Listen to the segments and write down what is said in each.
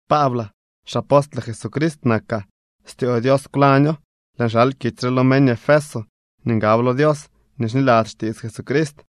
Paablaa, xapostle Jesucrist nakaa. Styoo Dios kwlaño. Lëën xal kitsy re lo meñ Efeso nii ngab lo Dios nii xniladzy xtiits Jesucrist.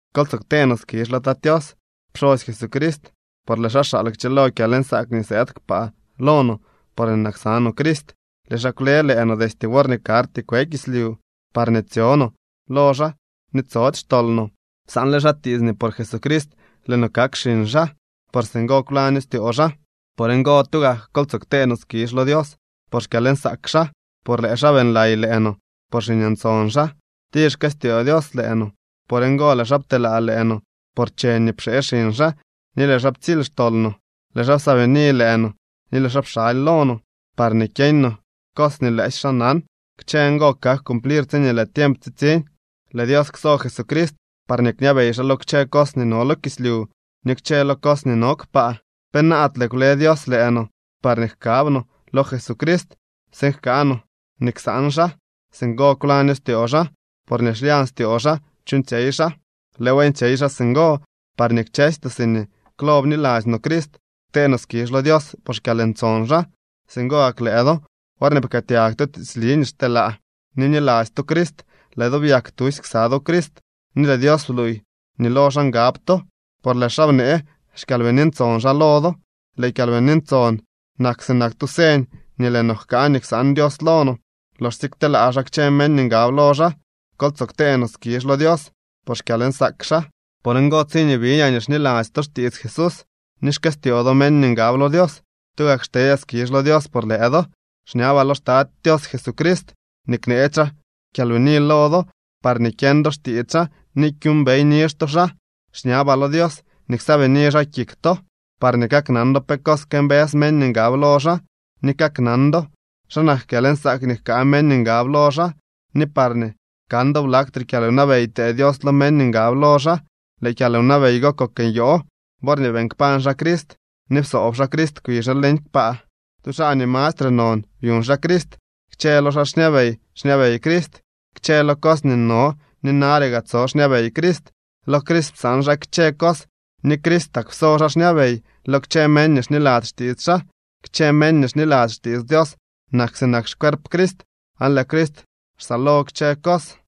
Kol tsoo ktee no skizh lo Tat Tios, pxosy Jesucrist, por lëë xaa xaal kchëlo kyalnsaak nii sëëd kpaa lo no porñee nak ksa no Crist. Lëë xaa kwle lëë no destye worñee karty kwe kislyu, parñee tsyo no lo xaa ni tsody xtol no. Psaanle xaa tiits nii por Jesucrist lëë no kak xiñ xaa. Por singo kwlaño styoo xaa. Por ngo, tugak kol tsoo ktee no skizh lo Dios por xkyalnsaak xaa, por lëë xaa beeñlay lëë no por xiñ ntson xaa. Tir xkëstyoo Dios lëë no. Por ngo lëë xaa pteelaa lëë noo por cheñ nii pxee xiñ xaa ni lëë xaa ptsily xtol no. Lëë xaa psaabini lëë no ni lëë xaa pxaly lo no parñee kyeeñ no cos nii lëësy xaa nan. Kchë ngo kak cumplir tsiñee lëë tiemp tsitsiñ. Lëë Dios kso Jesucrist parñee kñabey xaa lo kchë cos nii no lo kislyu ni kchë lo cos nii no kpaa. Penaadle kwle Dios lëë no parñee jkab no lo Jesucrist tsiin jkaa no nii ksaan xaa. Singo kwlaño styoo xaa, por nii xlyañ styoo xaa chuuñtsyey xaa. Lëëw beeñtsyey xaa singo, parñee kchësy noo siñee klo bniladzy noo Crist, ktee noo skizh lo Dios por xkyalntson xaa. Singo gak lëë do, worñee pkëëtyag to tiitsli nii xteelaa, ni bniladzy to Crist, lëë do byak tusy ksa do Crist ni lëë Dios bluuy nii lo xaa ngab to, por lëë xaa bnee xKyalbini Ntson xaa lo do. Lëë Kyalbini Ntson nak sinak tu señ nii lëë no jkaa nii ksaan Dios lo no, loxsye kteelaa xaa kchë meñ nii ngab lo xaa. Kol tsoo ktee no skizh lo Dios por xkyalnsaak xaa. Por ngo, tsiñee biñaa nii xniladzy to xtiits Jesús, ni xkëstyoo do meñ nii ngab lo Dios, tugak xtedyaa skizh lo Dios por lëë do. Xñabaa lo xTat Tios Jesucrist nii kneetsy xaa kyalnyaani lo do parñee kyeñ do xtiits xaa ni kyuumbey nizh to xaa. Xñabaa lo Dios nii ksaabini xaa kik to parñee kaknan do pe cos këmbës meñ nii ngab lo xaa, ni kaknan do xa nak kyalnsaak nii jkaa meñ nii ngab lo xaa, ni parñee kan do blaktre kyalwnabey ptee Dios lo meñ nii ngab lo xaa. Lëë kyalwnabey go kok nyoo worñee beeñ kpañ xaa Crist ni psoob xaa Crist kwi xaa leñ kpaa. Tu xaa nii mastre non byuñ xaa Crist. Kchë lo xaa xñabey xñabey Crist. Kchë lo cos nii no ni nare gaa tso xñabey Crist. Lo Crist psaan xaa kchë cos ni Cristak pso xaa kñabey lo kchë meñ nii xniladzy xtiits xaa. Kchë meñ nii xniladzy xtiits Dios nak sinak xcuerp Crist, aan lëë Crist xsaalo kchë cos.